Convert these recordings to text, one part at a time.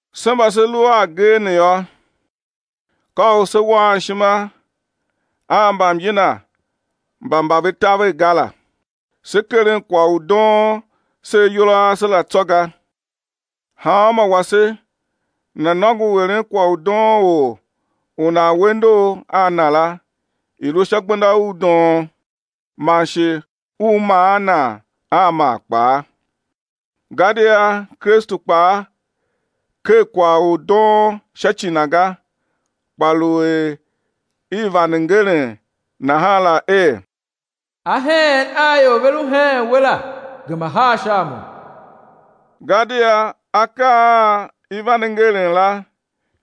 Se mba se lu a agee ne yô, ka u se̱ waan ishima a mbamyina mba mba ve taver ga la, se̱ keren kwagh u doon se ayol a ase la tsô ga. Hanmô wase nana̱ nôngo u eren kwagh u doon or u nan we ndor a nan la i̱ lu sha gbenda u doon, man shi u maan nan a maa kpaa. Gadia Kristu kpaa ker kwagh u doon sha ci Na ga, kpa lu er i vande ngeren nahan la er: Aheen a ior ve lu heen We la gema haa sha a Mo. Gadia akaa a i vande ngeren la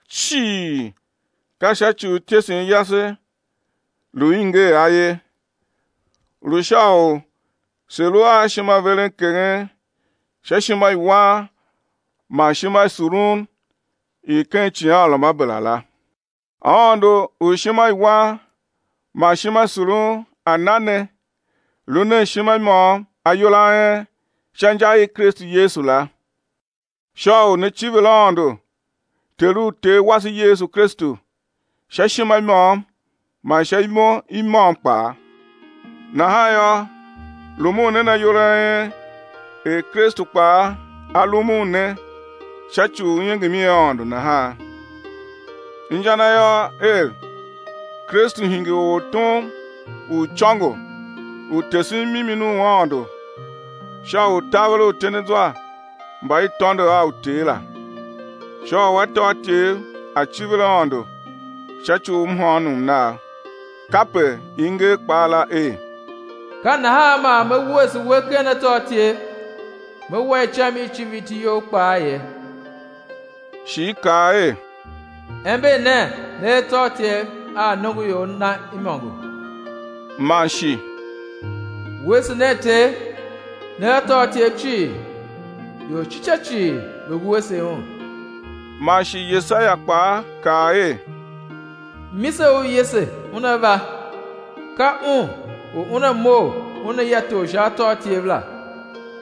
cii ka sha ci u ityesen yase lu i nger a ye, lu sha u se̱ lu a ishimaverenkeghen sha ishimawan man ishimasurun i ken icighanruamabera la. Aôndo u ishimawan man ishimasurun A̱ na ne, lu nen ishima i môm ayol a en sha inja i Kristu Yesu la, sha u né civir Aôndo Ter u Ter wase Yesu Kristu sha ishima i môm man sha imo i môm kpaa. Nahan yô, rumun nen ayol a en er Kristu kpaa A rumun ne sha ci u iengem i Aôndo nahan. Inja na yô, er, Kristu hingir ortom u icôngo u tesen mimi u Aôndo sha u taver uityendezwa mba i tôndo a uter la, sha u atôatyev a̱ civir Aôndo sha ci u mhôônom nam. Kape i nger kpaa la er: Ka nahan man me wuese we ken atôatyev, Me wa icam i civir iti You kpaa ye. Shi i kaa er: Ember nen ne atôatyev a nongoior Na imôngo. Man shi: Wuese nen Ter, ne atôatyev cii, ior ci ca cii, ve̱ wuese Un. Man shi Yesaia kpaa kaa er, Mise u Yese Una va, ka Un u Una mough Una ya tor sha atôatyev la,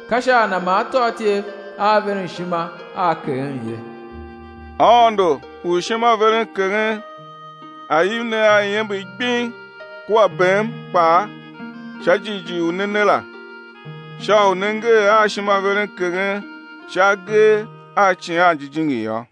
ka sha a Na man atôatyev aa veren ishima aa keghen ye. Aôndo u ishimaverenkeghen A̱ iv ne a iember gbing kua bem kpaa sha jighjigh u ne ne la, sha u né ngee a ishimaverenkeghen sha agee a Icighan Jijingi yô.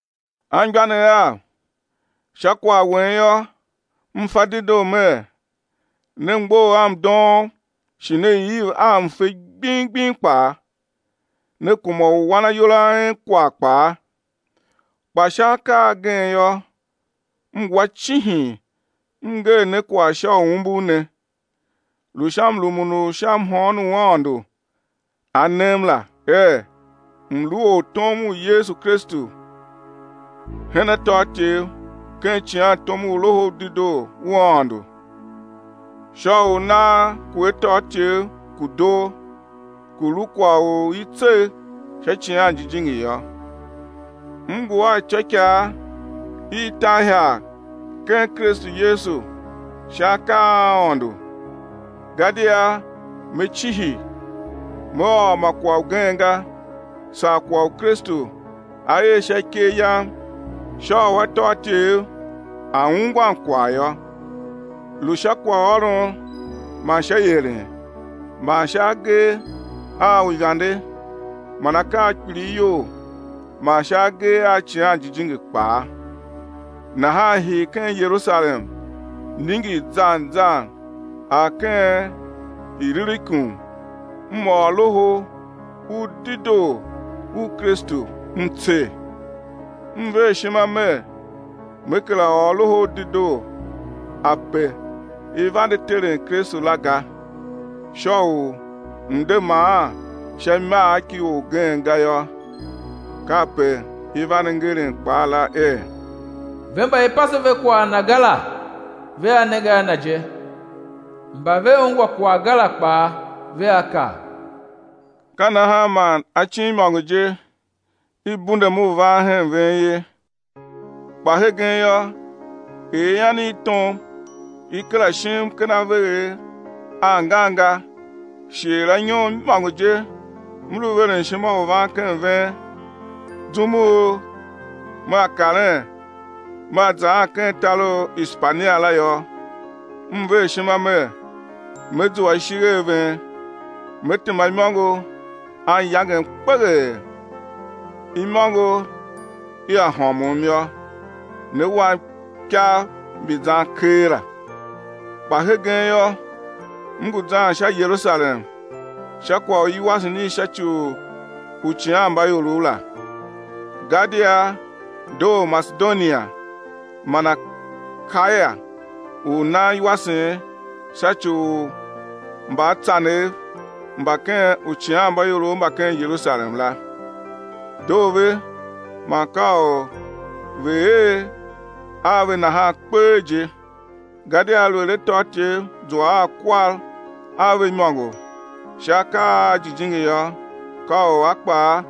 Anmgbianev av, sha kwagh wen yô, m fa dedoo mer ne mgbough a mdoom shi ne iv a mfe gbing gbing kpaa, ne kuma u wan ayol a en kwagh kpaa. Kpa sha akaa agen yô, m wa cihin m nger ne kwagh sha u umbur ne, lu sha mrumun u sha mhôôn u Aôndo A nem la er m̱ lu ortom u Yesu Kristu hen atôatyev ken icighantom u Loho u Dedoo u Aôndo, sha u nagh ku atôatyev ku̱ doo, ku̱ lu kwagh u i tsegh sha Icighan Jijingi yô. M ngu a ityôikaa i tan ihagh ken Kristu Yesu sha akaa a Aôndo. Gadia me cihi me ôr ma kwagh ugen ga saa kwagh u Kristu A er sha ikev yam sha u atôatyev a̱ ungwan kwagh yô, lu sha kwaghôron man sha ieren man sha agee a uivande man akaa a kpilighyol man sha agee a Icighan Jijingi kpaa. Nahan hii ken Yerusalem ningir zan zan ar ken Ilirikum m ôr Loho u Dedoo u Kristu m tser. M ver ishima mer me kera ôr Loho u Dedoo ape i vande teren Kristu la ga, sha u m̱ de maan sha imagh ki orgen ga yô. Kape i vande ngeren kpaa la er: Ve mba i pase ve kwagh Na ga la, vea nenge a Na je, mba ve ungwa kwagh ga la kpaa, vea kav. Ka nahan man acin imôngo je i bundum u van hen ven ye. Kpa hegen yô, er ian i tom i kera shim ken avegher angan ga shi er anyom imôngo je m lu veren ishima u van ken ven, zum u mea karen me zaan ken tar u Ishpania la yô, m ver ishima mer me zua ishigh a ven, me tema imôngo anyangem kpeghee, imôngo ia hômon yô, né wam ikav mbi zan keela. Kpa hegen yô, m ngu zan sha Yerusalem sha kwagh u iwasen i sha ci u uicighanmbaiorov la, gadia doo Masedonia man Akaya u nan iwasen sha ci u mbaatsanev mba ken uicighanmbaiorov mba ken Yerusalem la. Doo ve man ka u ve̱ er a ve nahan kpee je, gadia aluer atôatyev zua a kwar a ve imôngo sha akaa a jijingi yô, ka u a kpaa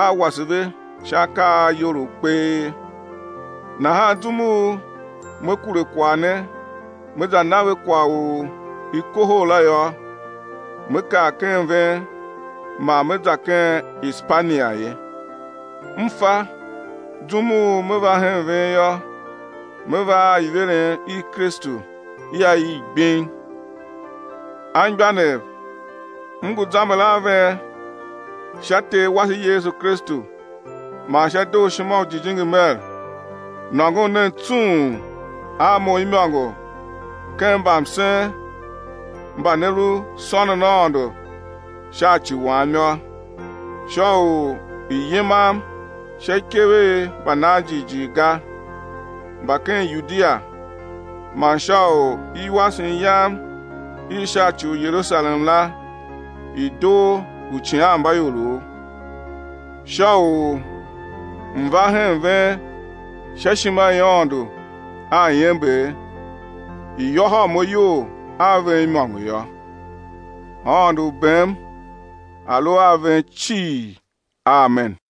a̱ wase ve sha akaa a iyolough kpee. Nahan zum u me kure kwagh ne me za na ve kwagh u i kohol la yô, me kar ken ven man me za ken Ishpania ye. M fa, zum u me va hen ven yô, me va a iveren i Kristu ia iv gbing. Anmgbianev, m ngu zamber a ven sha Ter wase Yesu Kristu man sha dooshima u Jijingi mer, nôngon nen tsung a mo imôngo ken mbamsen mba ne lu sônon Aôndo sha ci wam yô, sha u i̱ yimam sha ikev i mbanan jighjigh ga mba ken Yudia man sha u iwasen yam i sha ci u Yerusalem la i̱ doo uicighanmbaiorov, sha u m̱ va hen ven sha ishima i Aôndo a iember, i̱ yôhôl mo iyol a ven imôngo yô. Aôndo u bem A̱ lu a ven cii. Amen.